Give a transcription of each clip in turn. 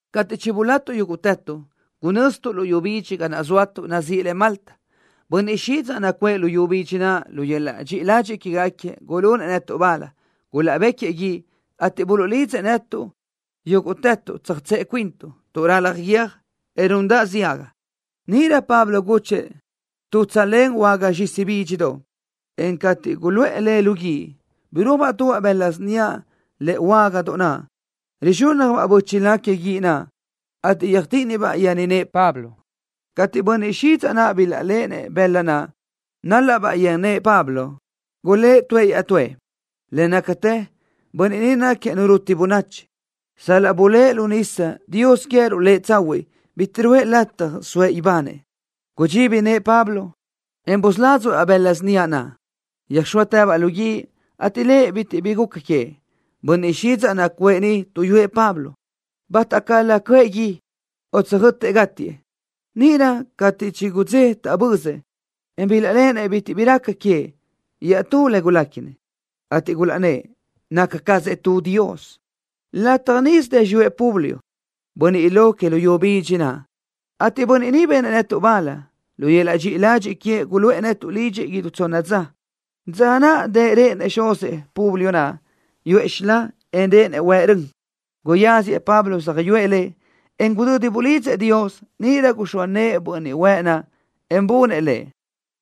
Cateʼ chibulatuʼ yúguʼtëtuʼ, gunöztuʼ luyú bidxi ga naʼ zóatuʼ nazíʼi le Malta. Bönniʼ xidzaʼ nacuʼë luyú bidxi naʼ lu yöl-laʼ dxiʼi ladxiʼ quégaquiëʼ gulunëʼ netuʼ bal. Gulaʼbéquiëʼ guíʼ, ateʼ buluʼlidzëʼ netuʼ yúguʼtëtuʼ iditsëʼe cuintuʼ, tuʼ ralaj guiö́j, en rundaʼ ziaga. Níʼirö Pablo gúchëʼë tu tsölén huága zxisi bídxidoʼ, en cateʼ guluʼë le lu guíʼ, birúajbaʼ tubaʼ bëla síniaʼ lëʼe huágadoʼ, rizxúnnajbaʼ bö́chila que guíʼ naʼ, ateʼ yöjtíʼinibaʼ yen nëʼë Pablo. Cateʼ bönniʼ xidzaʼ naʼ bilaʼléʼenëʼ bëla naʼ, nálaʼbaʼ yen nëʼë Pablo, gulë́ʼ tuëʼ iaʼtúëʼ: —Le nácatë bönniʼ ni náquiëʼ nu ruti bönachi. Sal-laʼ bulë́ʼ lu nísadoʼ, dios queë́ruʼ lëʼ Tsahuiʼ bitiʼ ruʼë lëʼ lataj soëʼ ibanëʼ. Gudxibi nëʼë Pablo, en busládzuʼë-baʼ bëla síniaʼ naʼ. Yöjxóatëbaʼ lu guíʼ, ateʼ lëʼ bitiʼ bi guca queëʼ. Bönniʼ xidzaʼ nacuʼë niʼ tuʼyúëʼ Pablo, bátacalö cöʼë gui, o tsö́ʼötëʼ gátiëʼ. Níʼirö cateʼ chigudzé taʼbözëʼ, en bilaʼléʼenëʼ bitiʼ bi raca queëʼ, iaʼtú le guléquinëʼ, ateʼ gulaʼnnë́ʼ naca cazëʼ tu dios. Lataj níʼisö dë xiyúëʼ Publio, bönniʼ lo que luyú bidxi naʼ, ateʼ bönniʼ ni benëʼ netuʼ bal. Lu yöl-laʼ dxiʼi ladxiʼ queëʼ guluʼë netuʼ lidxëʼ idú tsonna dza. Dza naʼ dëʼ réʼenëʼ xuzëʼ Publio naʼ, yuʼë xilá, en réʼenëʼ huëʼ rön. Guyáziëʼ Pablo söjyúëʼ lëʼ, en gudödi bulidzëʼ Dios, níʼirö guxóa nëʼë bönniʼ huëʼ naʼ, en bunëʼ lëʼ.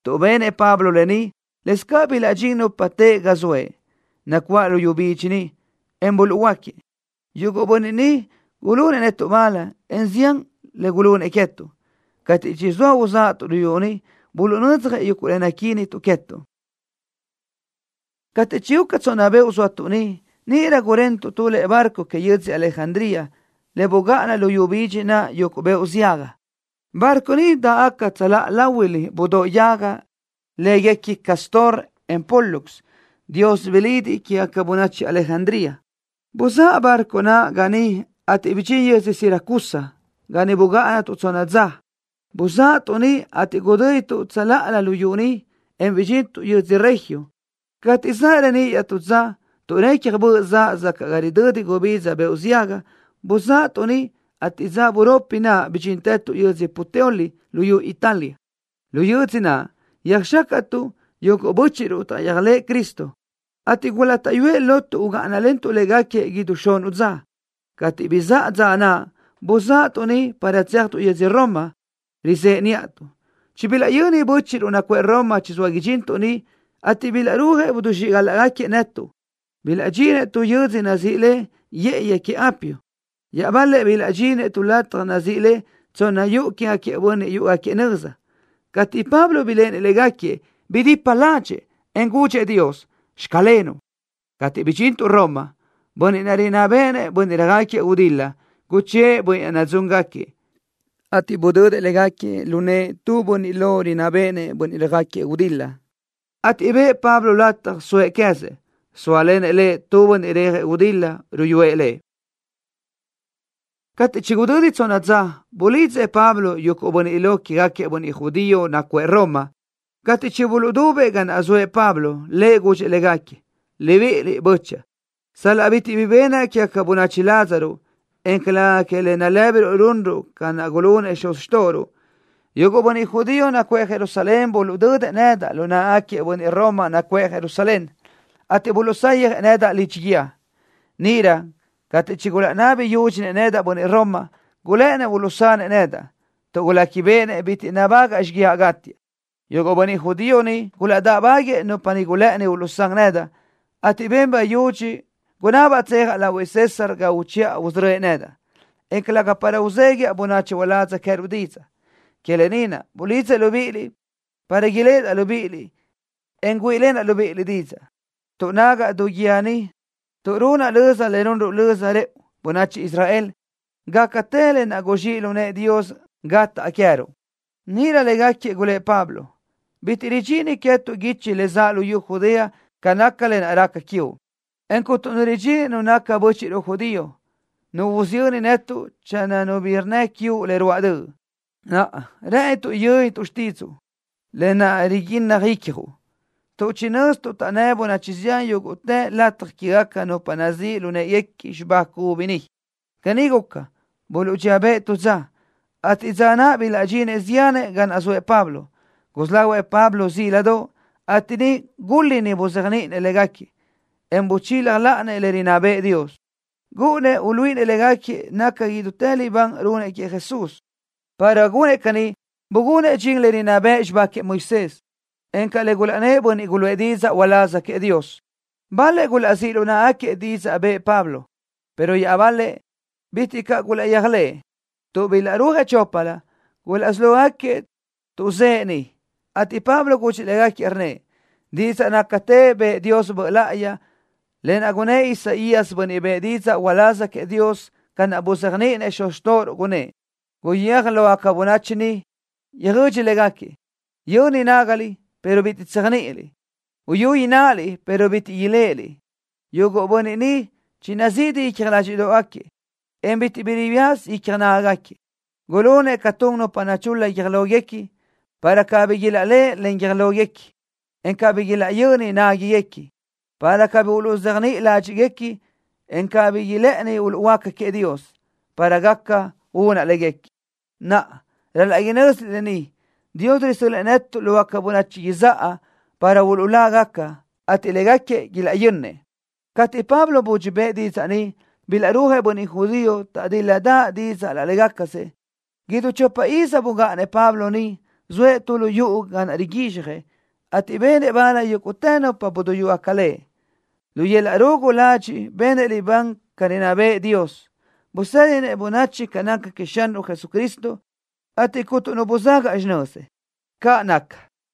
Tuʼ benëʼ Pablo lë ni, lëscaʼ bilaʼdxín nupa teʼe ga zoëʼ, nacuáʼ luyú bidxi niʼ, en buluʼhuöáquiëʼ. Yuguʼ bönniʼ ni gulunëʼ netuʼ bal, en zián le gulunëʼ queë́tuʼ. Cateʼ chizóa uzáʼatuʼ luyú niʼ, buluʼnödzjëʼ yuguʼ le naquínituʼ queë́tuʼ. Cateʼ chiguca tsonna beoʼ zóatuʼ niʼ, níʼirö gurentuʼ tu lëʼe barco que yödzö Alejandría, le bugáʼana luyú bidxi naʼ yuguʼ beoʼ ziaga. Barco ni dáʼgaca tsöláʼa láhuilö budóʼ yaga lë́guequi Cástor, en Pólux, dios bilidiʼ quégaca bönachi Alejandría naʼ. Buzáʼa barco naʼ ga niʼ, ateʼ bidxín yödzö Siracusa, ga niʼ bugáʼanatuʼ tsonna dza. Buzáʼatuʼ niʼ, ateʼ gudö́dituʼ tsöláʼalö luyú niʼ, en bidxintuʼ yödzö Regio. Cateʼ zaʼ reníʼ iaʼtú dza, tuʼ recja böʼ zaʼ sacaʼ ga ridödi gubidza beoʼ ziaga, buzáʼatuʼ niʼ, ateʼ dza buropi naʼ bidxíntëtuʼ yödzö Puteoli luyú Italia. Lu yödzö naʼ yöjxácaʼtuʼ yuguʼ bö́chiʼruʼ taʼyéajlëʼë Cristo, ateʼ gulátaʼyuëʼ lotuʼ ugáʼanalentuʼ légaquiëʼ idú xunuʼ dza. Cateʼ bizáʼa dza naʼ buzáʼatuʼ niʼ para tséajtuʼ yödzö Roma, rizëʼe níʼatuʼ. Chibilaʼyönnëʼ bö́chiʼruʼ nacuʼë Roma chizóa idxintuʼ niʼ, ateʼ bilaʼrúajëʼ idixíʼgalaʼgaquiëʼ netuʼ. Bilaʼdxinëʼ tu yö́dzödoʼ nazíʼi le Yë́ʼëyi Que Apio. Iaʼbal-lëʼ bilaʼdxinëʼ tu lataj nazíʼi le Tsonna Yuʼu Quégaquiëʼ Bönniʼ Yúʼugaquiëʼ Nöza. Cateʼ Pablo biléʼenëʼ légaquiëʼ, bidipa ládxëʼë, en gudxëʼ Dios: “Xclenuʼ.” Cateʼ bidxintuʼ Roma, bönniʼ naʼ rinná béʼenëʼ bönniʼ röjáquiëʼ gudil-la, guchë́ʼë bönniʼ naʼ nadzúngaquiëʼ, ateʼ budödëʼ légaquiëʼ lu nëʼë tu bönniʼ lo rinná béʼenëʼ bönniʼ röjáquiëʼ gudil-la, ateʼ bëʼë Pablo lataj soëʼ queë́zëʼ, zóalenëʼ lëʼ tu bönniʼ rejëʼ gudil-la ruyúëʼ lëʼ. Cateʼ chigudödi tsonna dza, bulidzëʼ Pablo yuguʼ bönniʼ lo quégaquiëʼ bönniʼ judío nacuʼë Roma. Cateʼ chibuluʼdubëʼ ga naʼ zoëʼ Pablo, lëʼ gudxëʼ légaquiëʼ: —Libíʼiliʼ, bö́chaʼa, sal-laʼ bitiʼ bi benaʼ quégaca bönachi ládzaruʼ, en calëga que le nalë́biruʼ runruʼ ca naʼ gulunëʼ xuz xtóʼoruʼ, yuguʼ bönniʼ judío nacuʼë Jerusalén buluʼdödëʼ nedaʼ lu náʼagaquiëʼ bönniʼ Roma nacuʼë Jerusalén, ateʼ buluʼsayjëʼ nedaʼ lidxi guíë. Níʼirö cateʼ chigulaʼnabi yúdxinëʼ nedaʼ bönniʼ Roma, gulë́ʼënnëʼ uluʼsanëʼ nedaʼ, tuʼ guléquibeʼenëʼ bitiʼ nabágaʼa xíguiaʼ gátiaʼ. Yuguʼ bönniʼ judío niʼ gulaʼdáʼbáguëʼë nupa naʼ gulë́ʼëni uluʼsán nedaʼ, ateʼ ben bayudxi gunabaʼ tsejaʼ lahuëʼ César ga uchiʼa usörö́ëʼ nedaʼ, en calëga para uzéguiaʼ bönachi uládz queë́ruʼ didzaʼ. Que lë ni naʼ bulidzaʼ libíʼiliʼ para iléʼedaʼ libíʼiliʼ, en güíʼilenaʼ libíʼiliʼ didzaʼ, tuʼ nágaʼa du guíë ni tuʼ runaʼ löza le runruʼ löza rëʼu, bönachi Israel, gácatë lë naʼ guzxíʼ lu nëʼë Dios gataʼ queë́ruʼ. Níʼirö légaquiëʼ gulë́ʼ Pablo: —Bitiʼ ridxini queë́tuʼ guichi le zaʼ luyú Judea ca naca lë naʼ raca quiuʼ, en cuntu nu ridxini nu naca bö́chiʼruʼ judío, nu usiyöni netuʼ channö nu bi rnnë quiuʼ le ruáʼ döʼ. Naʼa, rë́ʼënituʼ yö́nituʼ xtídzuʼu, lë naʼ riguinnaj icjuʼ, tuʼ chinö́zituʼ taʼnnë́ bönachi yúguʼtë lataj quégaca nupa nazíʼ lu në́ʼeguequi xibá cubi ni. Caní guca, buluʼdxíëʼ bëʼ tu dza, ateʼ dza naʼ bilaʼdxinëʼ ziánëʼ ga naʼ zoëʼ Pablo. Gusí lahuëʼ Pablo zíladoʼ, ateʼ niʼ gúl-liʼni buzéajniʼinëʼ légaquiëʼ, en buchila láʼanëʼ le rinná bëʼë Dios. Gúʼunnëʼ uluíʼinëʼ légaquiëʼ naca idútë li libán runëʼ queëʼ Jesús. Para gunëʼ caní bugunëʼ dxin le rinná bëʼ xibá queëʼ Moisés, encaʼ le gulaʼnnë́ʼ bönniʼ guluʼë didzaʼ uláz queëʼ Dios. Bal-lëʼ gulaʼzíʼ lu náʼagaquiëʼ didzaʼ bëʼë Pablo, pero iaʼbal-lëʼ bitiʼ caʼ gulaʼyéajlëʼë. Tuʼ bilaʼrúajëʼ choplö, gulaʼsí lógaquiëʼ tuʼzë́ʼë niʼ, ateʼ Pablo gudxëʼ légaquiëʼ, rnnëʼ: —Didzaʼ nácatë bëʼë Dios Böʼ Láʼayi, lë naʼ gunnë́ʼ Isaías, bönniʼ bëʼë didzaʼ uláz queëʼ Dios, ca naʼ buzéajniʼinëʼ xuz xtóʼoruʼ, gunnë́ʼ: Guyéaj lógaca bönachi niʼ, yöjödxi légaquiëʼ: Yöni nágaliʼ, pero bitiʼ tséajniʼiliʼ. Uyuliʼ ináʼaliʼ, pero bitiʼ iléʼeliʼ. Yuguʼ bönniʼ ni chinazidi icja ládxiʼdoʼgaquiëʼ, en bitiʼ bi riyaza icja nágagaquiëʼ. Gulunëʼ ca tun nupa nachul-la guiö́j lóguequi para cabí ilaʼléʼe len guiö́j lóguequi, en cabí ilaʼyöni nágaguequi para cabí uluʼzéajniʼi ládxiʼguequi, en cabí ilë́ʼëni uluʼhuöáca queëʼ Dios para gaca unaʼ léguequi. Naʼa, ral-laʼ inö́ziliʼ lë ni. Dios risö́l-lëʼë netuʼ lógaca bönachi izáʼa para uluʼlágaca, ateʼ légaquiëʼ ilaʼyönnëʼ. Cateʼ Pablo budxi bëʼë didzaʼ ni, bilaʼrúajëʼ bönniʼ judío, taʼdíl-ladaʼ dídzëʼë laʼ légacasëʼ. Idú chopa iz bugáʼanëʼ Pablo niʼ, zoëʼ tu lu yuʼu ga naʼ riguizxjëʼ, ateʼ benëʼ bal yúguʼtë nupa buduyúgaca Lëʼ. Lu yöl-laʼ rugu ladxiʼ benëʼ libán ca rinná bëʼë Dios. Busédinëʼ bönachi ca naca queëʼ Xanruʼ Jesucristo, ateʼ cuntu nu buzagaʼ xinözëʼ. ¡Caʼ naca!